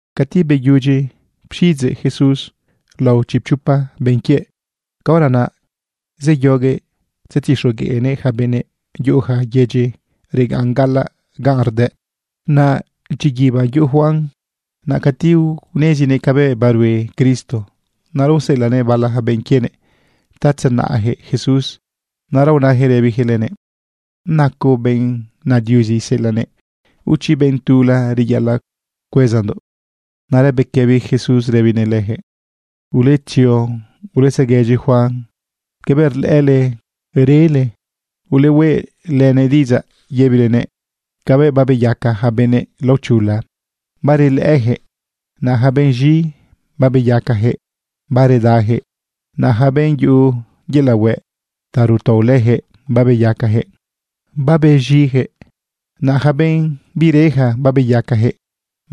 Cati beyudyi pxiꞌidzeꞌ Jesús lao chipchopa benꞌ quiëꞌ, caora naꞌ zeyoguëꞌ tzetixogueꞌnëꞌ ja benëꞌ yuꞌuja yedyi regaꞌn gaꞌalaꞌ ganꞌ rdëꞌ. Naꞌ dyiguiba yuꞌu Juan naꞌ cati unezinëꞌ cabëꞌ barue Cristo. Naꞌra useꞌelaꞌnëꞌ bala benꞌ quienëꞌ ta tzenaꞌjëꞌ Jesús. Naꞌra unajëꞌ rëbijëꞌ lënëꞌ: ―¿Nacoꞌ benꞌ na Diuzi iseꞌelaꞌnëꞌ o chi benꞌ tula reyaꞌalaꞌ cuezandoꞌ? Naꞌra bequëbi Jesús rëbinëꞌ lëjëꞌ: ―Uletzio uletzeguëdyi Juan cabëꞌ rlëꞌële rele. Ulehueꞌ lënëꞌ diꞌidzaꞌ yëbilenëꞌ cabëꞌ babeyaca ja benꞌ laochula, barelëꞌëjëꞌ. Naꞌ ja benꞌ z̃i, babeyacajëꞌ, baredajëꞌ. Naꞌ ja benꞌ yuꞌu yelaꞌ hueꞌ ta rutao lëjëꞌ, babeyacajëꞌ, babez̃ijëꞌ. Naꞌ ja benꞌ bireja, babeyacajëꞌ,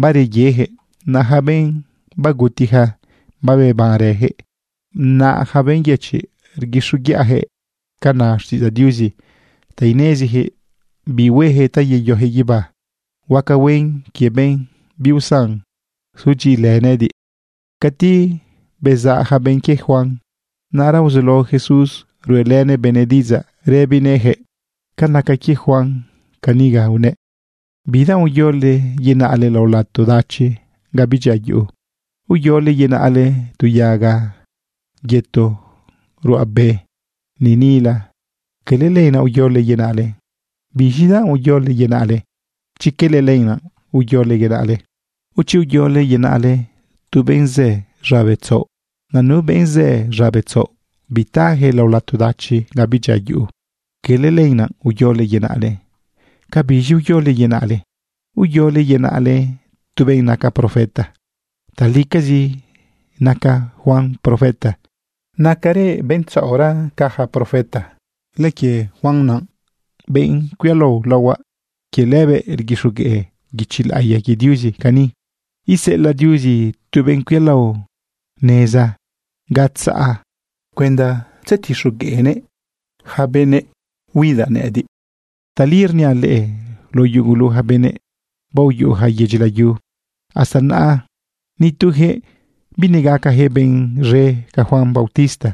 bareyejëꞌ. Naꞌ ja benꞌ bagutija, babebanrëjëꞌ. Naꞌ ja benꞌ yëchiꞌ, rguixoguiꞌajëꞌ ca na xtiꞌidzaꞌ Diuzi ta inezijëꞌ bi huejëꞌ ta yeyojëꞌ guibá. Huaca huen quie benꞌ biusan sudyiꞌilë nëꞌëdiꞌ. Cati bezaꞌ ja benꞌ quie Juan, naꞌra uzulao Jesús ruꞌelënëꞌ benëꞌ diꞌidzaꞌ rëbinëꞌjëꞌ ca naca quie Juan. Cani unëꞌ: ―¿Bidanꞌ uyole yenaꞌle lao lato dachi ga bidyia yuꞌu? ¿Uyole yenaꞌle tu yaga yëto ruꞌa be niꞌnila? Quele lenaꞌ uyole yenaꞌle. ¿Biz̃idanꞌ uyole yenaꞌle chi quele lenaꞌ uyole yenaꞌle? ¿O chi uyole yenaꞌle tu benꞌ zë z̃abe tzaoꞌ? Naꞌ nu benꞌ zë z̃abe tzaoꞌ bitajëꞌ lao lato dachi ga bidyia yuꞌu. Quele lenaꞌ uyole yenaꞌle. ¿Cabiz̃i uyole yenaꞌle? ¿Uyole yenaꞌle tu benꞌ naca profeta? Talicazi naca Juan profeta. Nacarëꞌ benꞌ tzaoꞌra ca ja profeta. Lëquie Juan naꞌ, benꞌ cuialao laohuaꞌ, quie lëbëꞌ rguixogueꞌ guichi laꞌiya quie Diuzi cani: Iseꞌelaꞌ Diuzi tu benꞌ cuialao neza ga tzaꞌ cuenda tzetixogueꞌnëꞌ yaca benëꞌ huidaꞌ nëꞌëdiꞌ. Tali rniaꞌ leꞌe, lao yugu ja benëꞌ baoyuꞌuja yedyi layu hasta naꞌa, nitujëꞌ binegacajëꞌ benꞌ z̃e ca Juan bautista.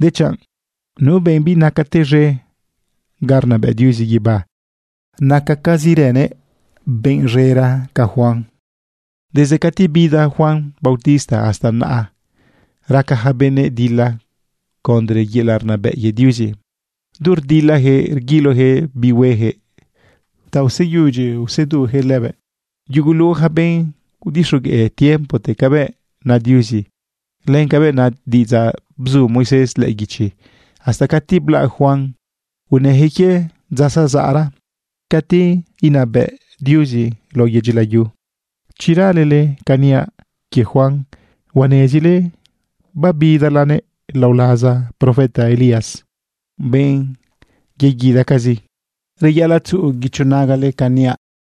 Dechanꞌ nu benꞌ binacate z̃e ga rnabëꞌ Diuzi guibá, nacacazirëꞌ benꞌ z̃era ca Juan. ’Desde cati bida Juan bautista hasta naꞌa, raca ja benëꞌ dila condre yelaꞌ rnabëꞌ quie Diuzi. Du rdilajëꞌ rguilojëꞌ bi huejëꞌ ta useyudyi usedujëꞌ lëbëꞌ. Yugulu ja benꞌ udixogueꞌ tiempote cabëꞌ na Diuzi, len cabëꞌ na diꞌidzaꞌ bzu Moisés lëꞌë guichi hasta cati blaꞌ Juan, unëjëꞌ quie dza zazaꞌra cati inabëꞌ Diuzi lao yedyi layu. Chi ralele ca niaꞌ quie Juan, huanezile babidalanëꞌ lao laza profeta Elías, benꞌ yeguidacazi. Reyaꞌalaꞌ tzuꞌu guicho nagale ca niaꞌ.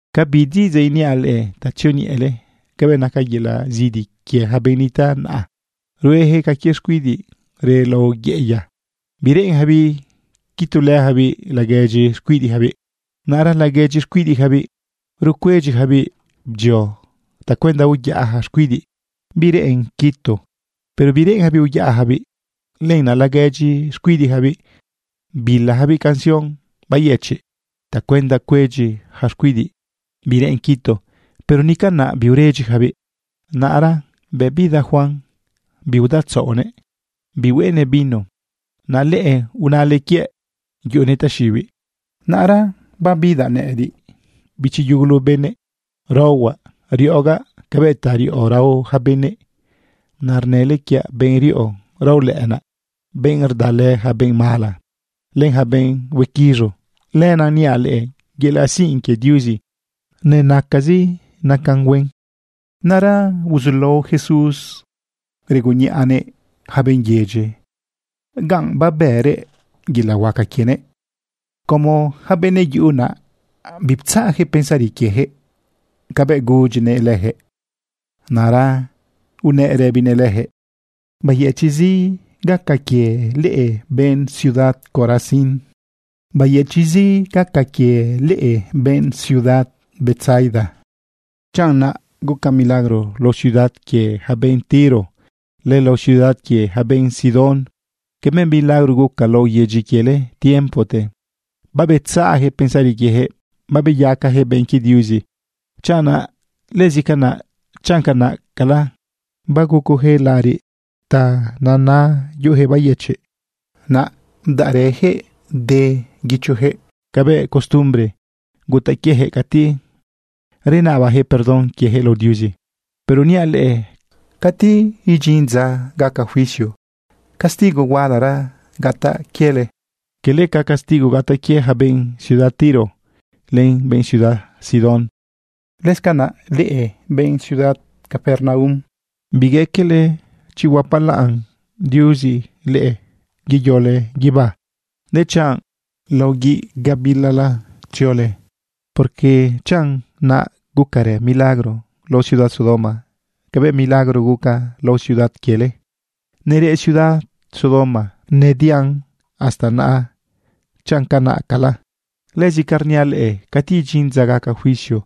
’¿Cabi diꞌidzaꞌ iniaꞌ leꞌe ta tzioñeꞌele cabëꞌ naca yelaꞌ zidi quie ja benꞌ nitaꞌ naꞌa? Ruejëꞌ ca quie xcuidiꞌ reꞌ lao yeꞌeya bireꞌenjabiꞌ quitulëjabiꞌ laguedyi xcuidiꞌjabiꞌ. Naꞌra laguedyi xcuidiꞌjabiꞌ rucuedyijabiꞌ bdyio tacuenda uyaꞌa ja xcuidiꞌ bireꞌen quitu. Pero bireꞌenjabiꞌ uyaꞌajabiꞌ. Lenaꞌ laguedyi xcuidiꞌjabiꞌ bilajabiꞌ canción bayëchiꞌ tacuenda cuedyi ja xcuidiꞌ bireꞌen quitu. Pero ni canaꞌ biuredyijabiꞌ. Naꞌra bëꞌ bida Juan, biudaotzaꞌonëꞌ bihueꞌenëꞌ vino. Naꞌ leꞌe unale quiëꞌ yuꞌunëꞌ taxiꞌibiꞌ. Naꞌra bëꞌ bidaꞌ nëꞌëdiꞌ, bichi yugulu benëꞌ, raohuaꞌ riꞌogaꞌ cabëꞌ ta riꞌo rao ja benëꞌ. Naꞌ rnële quiaꞌ benꞌ riꞌo raolëꞌënaꞌ, benꞌ rdalë ja benꞌ mala len ja benꞌ huequiz̃u. Lenaꞌ niaꞌ leꞌe, yelaꞌ sinꞌ quie Diuzi nenacazi nacan huen. Naꞌ ra uzulao Jesús regunniꞌanëꞌ ja benꞌ yedyi ganꞌ babërëꞌ yelaꞌ huaca quienëꞌ como ja benëꞌ yuꞌu naꞌ biptzaꞌjëꞌ pensari quiejëꞌ cabëꞌ gudyinëꞌ lëjëꞌ. Naꞌra unëꞌ rëbinëꞌ lëjëꞌ: ―¡Bayëchiꞌzi gaca quie leꞌe benꞌ ciudad Corazín! ¡Bayëchiꞌzi gaca quie leꞌe benꞌ ciudad Betsaida! Chanꞌ naꞌ guca milagro lao ciudad quie ja benꞌ Tiro, len lao ciudad quie ja benꞌ Sidón cabëꞌ milagro guca lao yedyi quiele tiempote, babetzaꞌjëꞌ pensari quiejëꞌ, babeyacajëꞌ benꞌ quie Diuzi chanꞌ naꞌ. Lëzi canaꞌ, chanꞌ canaꞌcala bagucojëꞌ laꞌariꞌ ta nena yuꞌujëꞌ bayëchiꞌ, naꞌ bdaꞌrëjëꞌ de guichojëꞌ cabëꞌ costumbre gutaꞌ quiejëꞌ cati renabajëꞌ perdón quiejëꞌ lao Diuzi. Pero niaꞌ leꞌe, cati idyin dza gaca juicio, castigo hualara gataꞌ quiele, quele ca castigo gataꞌ quie ja benꞌ ciudad Tiro len ja benꞌ ciudad Sidón. Lëscanaꞌ leꞌe benꞌ ciudad Capernaum, bigaquele chi huapalaꞌn Diuzi leꞌe yeyole guibá, dechanꞌ lao guiꞌ gabilala tziole, porque chanꞌ naꞌ gucarë milagro lao ciudad Sodoma cabëꞌ milagro guca lao ciudad quiele, nereꞌ ciudad Sodoma nedian hasta naꞌa chanꞌ canaꞌcala. Lëzi canaꞌ rniaꞌ leꞌe, cati idyin dza gaca juicio,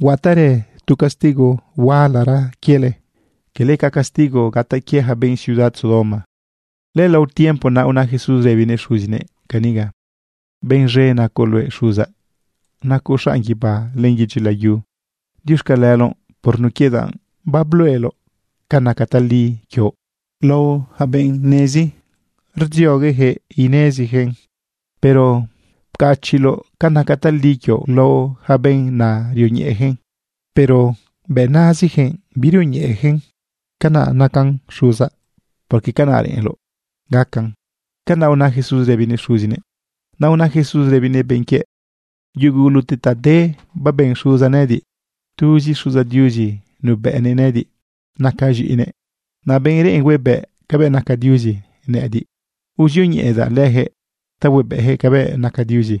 huataꞌrë tu castigo hualara quiele, quele ca castigo gataꞌ quie ja benꞌ ciudad Sodoma. Lëlao tiempo naꞌ una Jesús rëbinëꞌ Xuzinëꞌ caniga: ―Benꞌ z̃e nacoꞌ luëꞌ Xuzaꞌ. Nacoꞌ xanꞌ guibá len yedyi layu. Diuxcaleloꞌ por nun quie danꞌ babluꞌeloꞌ ca naca tali quioꞌ lao yaca benꞌ nezi rdzioguejëꞌ inezijëꞌn. Pero pcachiꞌloꞌ ca naca tali quioꞌ lao ja benꞌ na rioñeꞌejëꞌ, pero bëꞌ nazijëꞌ birioñeꞌejëꞌn. Canaꞌ nacan Xuzaꞌ, porque canaꞌ reꞌenloꞌ gacan. ―Canaꞌ una Jesús rëbinëꞌ Xuzinëꞌ. Naꞌ una Jesús rëbinëꞌ benꞌ quiëꞌ: ―Yugulute ta de baben Xuzaꞌ nëꞌëdiꞌ. Tuzi Xuzaꞌ Diuzi nubëꞌnëꞌ nëꞌëdiꞌ nacaꞌ z̃iꞌinëꞌ. Naꞌ benꞌ reꞌen huebëꞌ cabëꞌ naca Diuzi, nëꞌëdiꞌ uzioñeꞌedaꞌ lëjëꞌ ta huebëꞌjëꞌ cabëꞌ naca Diuzi.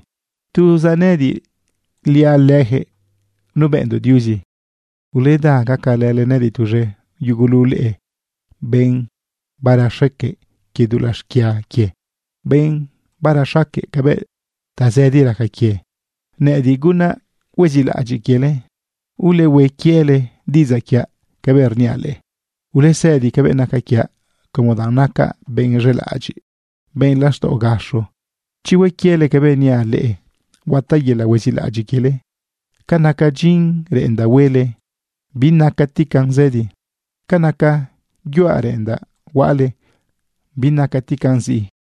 Tuzaꞌ nëꞌëdiꞌliaꞌ lëjëꞌ nubëꞌndoꞌ Diuzi. Uleda gacalële nëꞌëdiꞌ tuz̃e, yugulu leꞌe, benꞌ barexaque quie dulaꞌ xquia quie, benꞌ barexaque cabëꞌ tazëdi raca quie. Nëꞌëdiꞌ gunaꞌ huezilaꞌadyiꞌ quiele. Ulehue quiele diꞌidzaꞌ quiaꞌ cabëꞌ rniaꞌ leꞌe. Ulesëdi cabëꞌ naca quiaꞌ como danꞌ nacaꞌ benꞌ z̃elaꞌadyiꞌ, benꞌ laxtaꞌo gaxo. Chi hue quiele cabëꞌ niaꞌ leꞌe, huataꞌ yelaꞌ huezilaꞌadyiꞌ quiele. Ca naca dyin reꞌendaꞌ huele, binacatigan zëdi. Ca naca yuaꞌ reꞌendaꞌ huaꞌale, binacatigan ziꞌi.